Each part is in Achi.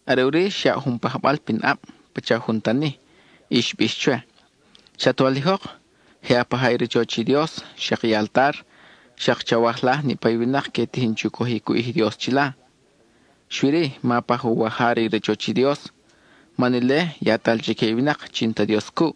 Are ʼuri xyaʼ jun pajbal pin ʼab, pacha jun tani, y xbix chwe: —Chat walijok, je a paja i rachoch i Dios, xak i altar, xak chawajlaj niʼpa i winak que tijin chu cojic u ʼij i Dios chila. Xui-ri, ma paj uwaja re i rachoch i Dios, man ile yatal chique i winak chi n-ta Dios cuʼ.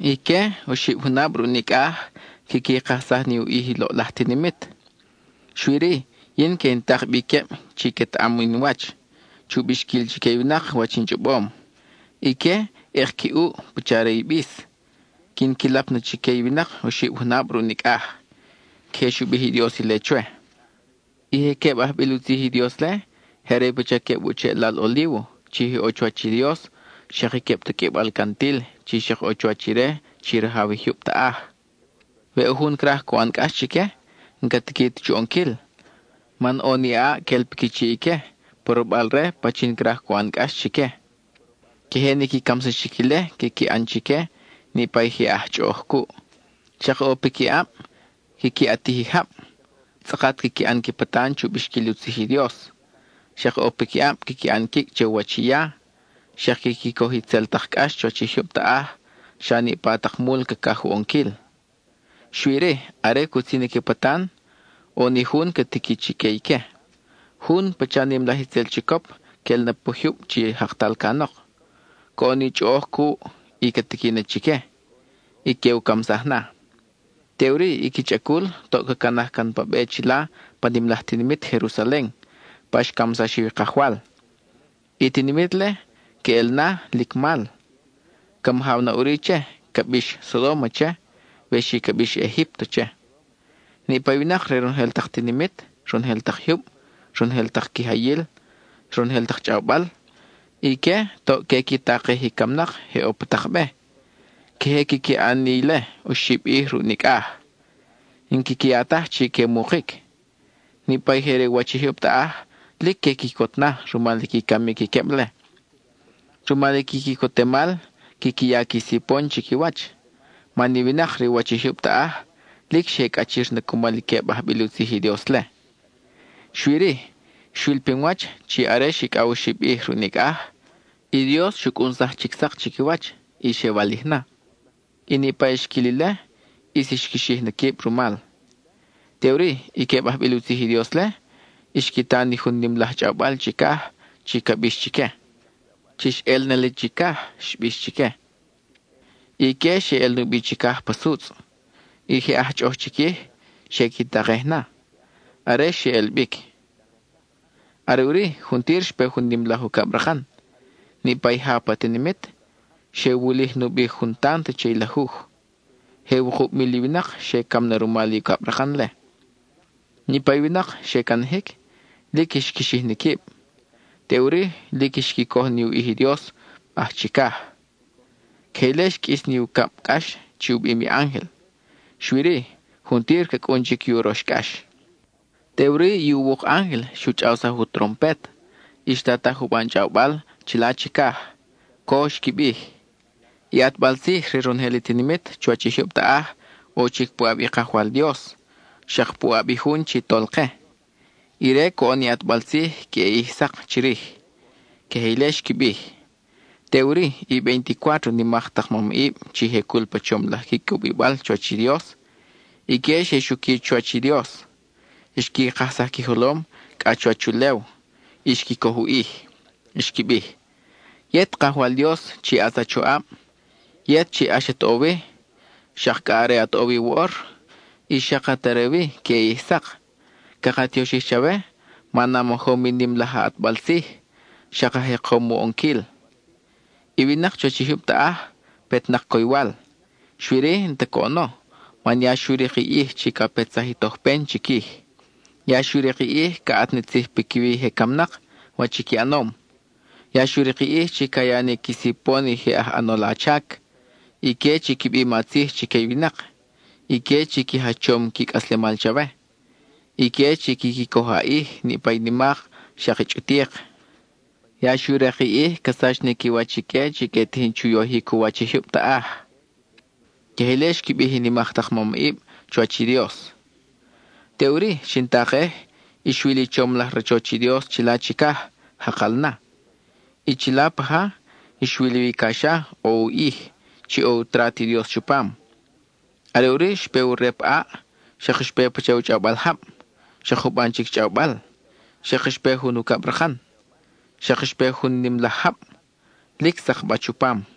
Ique, oxib junab ruʼ nicʼaj quiqui kajsaj ni u ʼij i loʼlaj tinimit. Xui-ri, yin que in tak bi queb chi quetaʼam in wach, chu bixquil chique i winak wach in chʼobom. Ique, ʼek qui ʼuʼ pacha re i bis; quin qui lap na chique i winak oxib junab ruʼ nicʼaj. (Queje xu bij i Dios ile chwe.) I je queb ajbil u tzij i Dios-le, je are i pacha queb u cheʼlal olívo chi je ʼo chuwach i Dios, xak i queb taqʼuibal cantil chi xak ʼo chuwach Ire, chi Rajaw i jyub taʼaj. We ʼo jun craj cu ʼan cʼax chique, n-ca tiqui ta chu ʼonquil, man ʼo ni ʼaʼ quel piqui chiʼ ique, porobal-re pachin craj cu ʼan cʼax chique. Queje ni qui camsaxic ile quiqui ʼan chique niʼpa i je aj chʼoʼoj cuʼ. Xak ʼo piquiʼab quiqui ʼatij i jab, tzʼakat quiqui ʼan qui patan chu bixquil u tzij i Dios. Xak ʼo piquiʼab quiqui ʼan quicʼ che u wach i ya, xak quiqui coj itzel tak cʼax chuwach i jyub taʼaj xa niʼpa tak mul cacaj u ʼonquil. Xui-ri, are cutzin i qui patan, ʼo ni jun ca tiqui chique ique. Jun pacha nim laj itzel chicop quel na pa jyub chi jaktal canok; coʼon ni chʼoʼoj cuʼ, y ca tiqui na chique, y que u camsaj na. Teʼuri i qui chʼacul toʼ ca canaj can pa be chila pa nim laj tinimit Jerusalen, pa xcamsax wi i Kajwal. I tinimit-le, queʼel na lic mal; ca majaw na ʼuri che, ca bix “Sodóma” che, we xi ca bix “Egípto” che. Niʼpa i winak re ronojel tak tinimit, ronojel tak jyub, ronojel tak quijayil, ronojel tak chʼawbal, ique toʼ que qui takej i camnak je ʼo pa tak be; queje quiqui ʼan ni ile oxib ʼij ruʼ nicʼaj. N-quiqui ya taj chi que mukic. Niʼpa i je re u wach i jyub taʼaj lic que quicot na rumal i qui camic i queb-le. Rumal i qui quicotemal, quiqui ya qui sipon chiquiwach, man i winak re u wach i jyub taʼaj lic xe cʼachir na cumal i queb ajbil u tzij i Dios-le. Xui-ri, xwil pinwach chi are xicʼaw oxib ʼij ruʼ nicʼaj, i Dios xu cʼunsaj chic sak chiquiwach, y xe walij na; y niʼpa i xquil ile ʼis xqui xij na quib rumal. Teʼuri i queb ajbil u tzij i Dios-le, xqui ta ni jun nim laj chʼawbal chicaj chi ca bix chique: —Chix ʼel na li chicaj —xbix chique. Ique xe ʼel nubi chicaj pa sutzʼ. I je aj chʼoʼoj chiquij xe qui takej na, are xe ʼel bic. Are ʼuri juntir xpe jun nim laj ucabrakan; niʼpa i ja pa tinimit, xe wulij nubi jun tant che i lajuj. Je wukub mil i winak xe cam na rumal i ucabrakan-le. Niʼpa i winak xe canajic, lic xqui xij ni quib; teʼuri lic xqui coj ni u ʼij i Dios aj chicaj. Queje ile xqʼuis ni ucab cʼax chi u bim i ángel, xui-ri, juntir ca cʼun chic i urox cʼax. Teʼuri i uwuk ángel xu chʼawsaj u trompet, y xtataj juban chʼawbal chila chicaj. Co xqui bij: I ʼatbal tzij re ronojel i tinimit chuwach i jyub taʼaj ʼo chic puʼab i Kajwal Dios, xak puʼab i jun chi Tolke. Ire coʼon ni ʼatbal tzij queʼe ʼij sak chirij. (Queje ile xqui bij.) Teʼuri i veinticuátro nimak tak mamʼib chi je cul pa chom laj qui cubibal chuwach i Dios, ique xe xuqui chuwach i Dios; xqui kajsaj qui jolom cʼa chuwach ulew y xqui coj u ʼij. Xqui bij: Yet, Kajwal Dios chi ʼatz a choʼab, yet, chi ʼax at ʼo wi, xak cʼa are at ʼo wi woʼor, y xak at are wi queʼe ʼij sak, caka tioxij chawe man a majom i nim laj a ʼatbal tzij, xak a jekom u ʼonquil. I winak chuwach i jyub taʼaj, petnak coywal, xui-ri, n-ta coʼono man ya xu rik i ʼij chi ca petsaj i tojpen chiquij. Ya xu rik i ʼij ca ʼat ni tzij piquiwi i je camnak, wach i qui ʼanom. Ya xu rik i ʼij chi ca ya ni qui sipon i je aj ʼanol a chac, ique chi qui bim a tzij chique i winak, ique chi qui jachom qui cʼaslemal chawe, ique chi quiqui coj a ʼij, niʼpa i nimak, xak i chʼutik. Ya xu rik i ʼij ca sach ni qui wach ique chi que tijin chu yojic u wach i jyub taʼaj. (Queje ile xqui bij i nimak tak mamʼib chuwach i Dios.) Teʼuri, xin takej, y xwil i chom laj rachoch i Dios chila chicaj, jakal na; y chila paja, xwil wi i caxa ʼo u ʼij, chi ʼo i u trat i Dios chupam. Are ʼuri, xpe u rep ʼaʼ, xak xpe pacha u chʼawbal jab, xak juban chic chʼawbal, xak xpe jun ucabrakan, xak xpe jun nim laj jab, lic sakbach u pam.